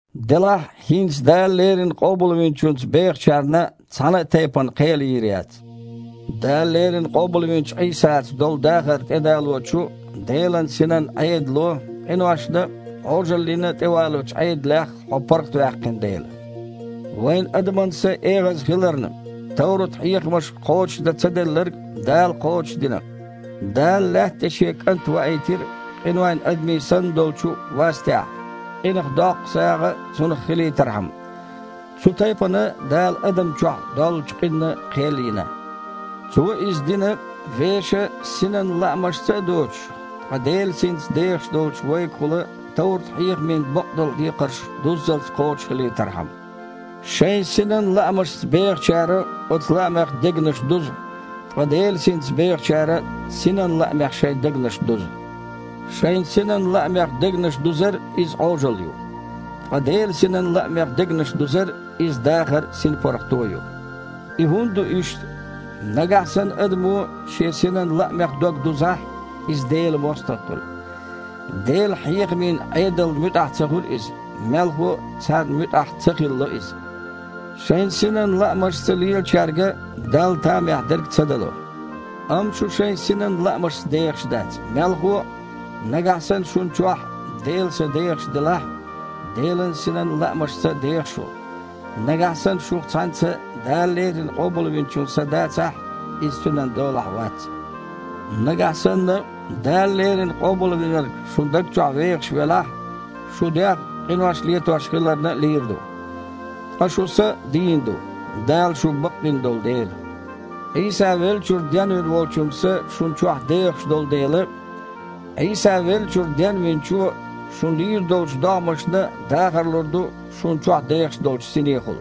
Делахь, хІинца Дала леррина Къобалвинчуьнца бехачарна цхьана а тайпана кхел йийр яц, Дала леррина къобалвинчу Іийсаца долу дахар тІедалочу Делан Синан Іедало къиношна а, Іожаллина а тІевалочу Іедалех хьо паргІатваьккхина дела. Вайн адаман са эгІаза хиларна, товрат-хьехамашка кхочушдан ца делларг Дала кхочушдина. Дала лаьтта тІе Шен КІант ваийтира къинойн адамийн санна долчу вастехь, къинах доккху сагІа Цунах хилийтархьама. Цу тайпана Дала адамна чохь доллучу къинна кхел йина. Цо иза дина, вешан синан лаамашца а доцуш, ткъа Делан Синца дехаш долчу вайгахула товрат-хьехамийн бакъдолу декхарш дуззалц кхочушхилийтархьама. Шайн синан лаамашца бехачара оцу лаамех дегнаш дузу, ткъа Делан Синца бехачара Синан лаамех шайн дегнаш дузу. Шайн синан лаамех дегнаш дузар – иза Іожалла ю, ткъа Делан Синан лаамех дегнаш дузар – иза дахар а, синпаргІато а ю. И хІунда ду иштта? Нагахь санна адамо шен синан лаамех дог дузахь, иза Делан мостагІа хуьлу. Делан хьехамийн Іедална муьтІахь ца хуьлу иза, мелхо а, царна муьтІахь ца хилало иза. Шайн синан лаамашца лелачаьрга Далла тамехь дерг ца дало. Амма шу шайн синан лаамашца дехаш дац. Мелхо а, нагахь санна шуна чохь Делан Са дехаш делахь, Делан Синан лаамашца деха шу. Нагахь санна шух цхьаьнца Дала леррина Къобалвинчун Са дацахь, иза Цуьнан долахь вац. Нагахь санна Дала леррина Къобалвинарг шун даг чохь вехаш велахь, шун дегІ, къинош летош хиларна, лийр ду, ткъа шун са дийна ду, Дала шу бакъдина долу дела. Іийса веллачуьра денвина Волчун Са шуна чохь дехаш долу дела, Іийса веллачуьра Денвинчо шун лийр долчу догІмашна а дахар лур ду шуна чохь дехаш долчу Синехула.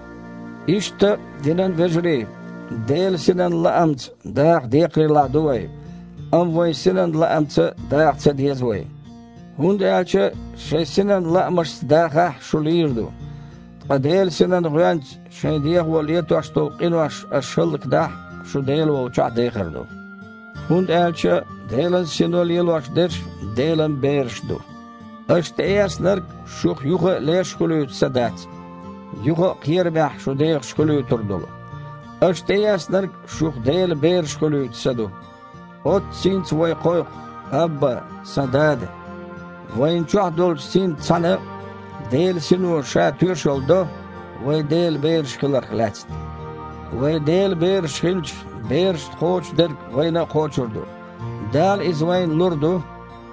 Иштта, динан вежарий, Делан Синан лаамца даха декхарийлахь ду вай, амма вайн синан лаамца даха ца деза вай. ХІунда аьлча шайн синан лаамашца дахахь – шу лийр ду, ткъа Делан Синан гІоьнца шайн дегІо летош долу къинош аша хІаллакдахь – шу Дела волчохь дехар ду. ХІунда аьлча Делан Сино лелош дерш Делан бераш ду. Аша тІеэцнарг шух юха а леш хуьлуьйту Са дац, юха а кхерамехь шу дехаш хуьлуьйтур долу. Аша тІеэцнарг шух Делан бераш хуьлуьйту Са ду. Оццу Синца вай кхойкху: «Абба, сан Дада!» Вайна чохь долчу синца цхьаьна Делан Сино Ша тоьшалла до вай Делан бераш хиларх лаьцна. Вай Делан бераш хилча, берашна кхочу дерг вайна а кхочур ду. Дала иза вайна лур ду,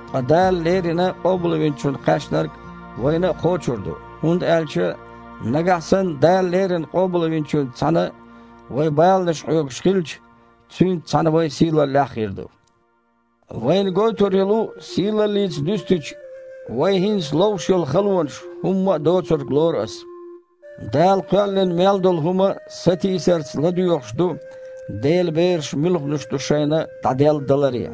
ткъа Дала леррина Къобалвинчунна кхаьчнарг вайна а кхочур ду, хІунда аьлча, нагахь санна Дала леррина Къобалвинчуьнца цхьаьна вай баланаш хьоьгуш хилча, Цуьнца цхьаьна вай сийлаллехь а хир ду. Вайна гойтур йолу сийлаллица дуьстича, вай хІинца ловш йолу халонаш хІумма а доцург лору ас. Дала кхоьллина мел долу хІума сатийсарца ладоьгІуш ду, Делан бераш муьлханаш ду шайна дІаделладаларе.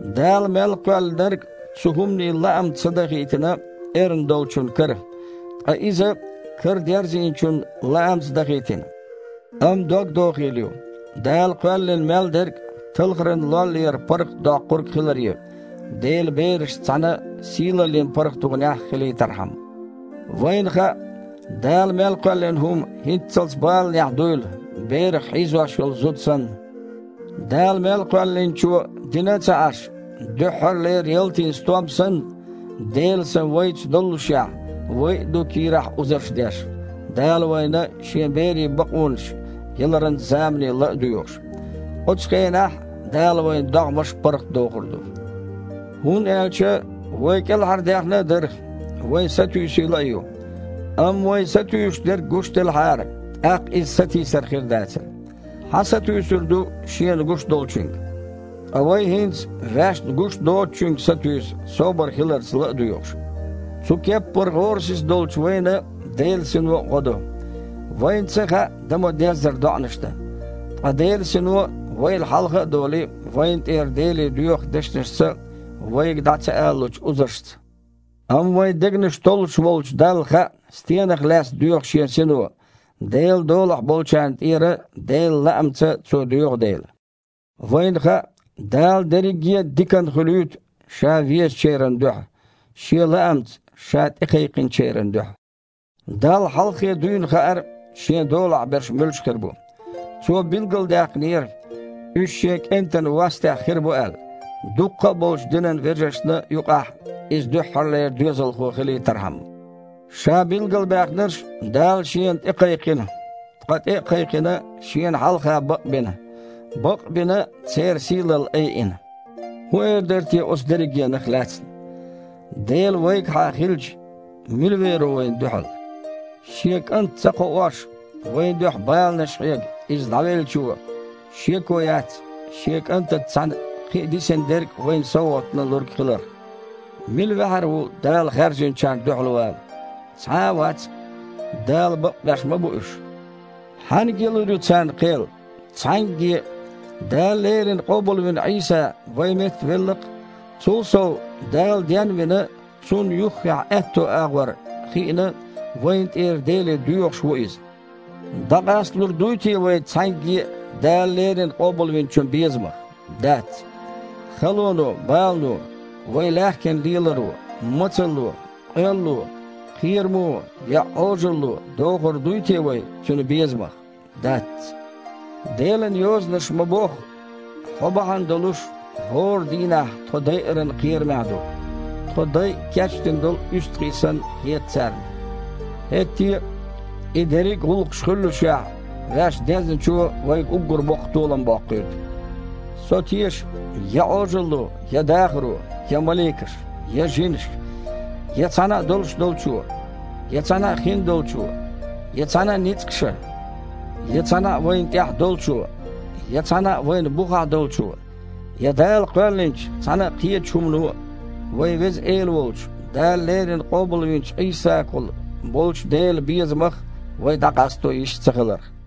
Дала мел кхоьллинарг цу хІуманийн лаамца ца дахийтина эрна долчун кара, ткъа иза Карадерзийначун лаамца дахийтина. Амма догдохийла ю, Дала кхоьллина мел дерг талхаран лоллера паргІатдоккхург хиларе, Делан берашца цхьаьна сийлаллин паргІатонехь хилийтархьама. Вайна хаьа, Дала мел кхоьллина хІума хІинццалц баланехь дуйла, берах хьийзош йолу зуда санна. Дала мел кхоьллинчо дина а ца Іаш, дуьххьарлера ялтин стом санна, Делан Са вайца доллушехь, вай а ду кийрахь узарш деш, Дала вайна Шен берийн бакъонаш яларан замане ла а доьгІуш. Оцу хенахь Дала вайн догІмаш паргІатдохур ду. ХІунда аьлча вай кІелхьардаьхна а дара, вайн сатуьйсийла а ю, амма вай сатуьйсуш дерг гуш делахьара, тІаккха иза сатийсар хир дацара. Хьан сатуьйсур ду шена гуш долчуьнга? Ткъа вай хІинца ваьшна гуш доцучуьнга сатуьйсу, собар хиларца ла а доьгІуш. Цу кеппара гІорасиза долчу вайна Делан Сино а гІо до. Вайна ца хаьа дан ма-деззара доІанаш дан. Ткъа Делан Сино, вайл хьалха а долий, вайна тІера Деле доьху дешнашца вайга дІа ца алалучу узаршца. Амма вайн дегнаш толлуш волчу Далла хаьа, стенах лаьцна доьху Шен Сино, Делан долахь болчарна тІера Делан лаамца Цо доьху дела. Вайна хаьа, Дала дерриге а диканна хуьлуьйту Ша везачеран дуьхьа – Шен лаамца Ша тІекхайкхинчеран дуьхьа. Далла хьалххе дуьйна хаьара, Шен долахь берш муьлш хир бу. Цо билгалдаьккхинера, уьш Шен КІентан вастехь хир бу аьлла, дуккха а болчу динан вежаршна юкъахь Иза дуьххьарлера доьзалхо хилийтархьама. Ша билгалбаьхнарш Дала Шена тІекхайкхина, ткъа, тІе а кхайкхина, Шена хьалха бакъбина, бакъ а бина, церан сийлалла айина. ХІун эр дара те оцу дерригенах лаьцна? Дела вайгахьа хилча, мила вер ву вайна дуьхьал? Шен КІант ца кхоош, вайн дуьхьа баланаш хьега Иза ДІавеллачо, шеко яц, Шен КІантаца цхьаьна кхин а дисина дерг а вайна совгІатна лург хиларх! Мила ваьхьар ву Дала хаьржинчарна дуьхьал вала? Цхьа а вац-кх! Дала бакъбеш ма бу уьш. Хьаьнга ялур ю царна кхел? Цхьаьнгге а! Дала леррина къобалвина Іийса вайн метта велла-кх. Цул сов, Дала ден а вина, Цунна юххехь аьтту агІор а хиъна, вайна тІера Деле доьхуш ву Иза. ДІакъастадалур дуй те вай цхьаьнгге а Дала леррина Къобалвинчун безамах? Дац! Халоно, балано, вай лаьхкина леларо, мацалло, къоьлло, кхерамо я Іожалло дохур дуй те вай Цуьнан безамах? Дац! Делан Йозанаша ма-бохху: «Хьо бахьана долуш, хІора дийнахь тхо дайаран кхерамехь ду. Тхо дайа кечдина долу уьстагІий санна хета царна». ХІетте а, и дерриг а гІуллакхаш хуьллушехь, ваьш Дезначо вайга уггар боккха толам боккхуьйту. Со теша, я Іожалло, я дахаро, я маликаша, я жинаша, я цхьана а долуш долчо, я цхьана а хиндолчо, я цхьана а ницкъаша, я цхьана а вайна тІехь долчо, я цхьана а вайна бухахь долчо, я Дала кхоьллинчу цхьана а кхечу хІумано а вайн Веза Эла волчу, Дала леррина къобалвинчу Іийсагахула болчу Делан безамах вай дІакъасто йиш цахиларх.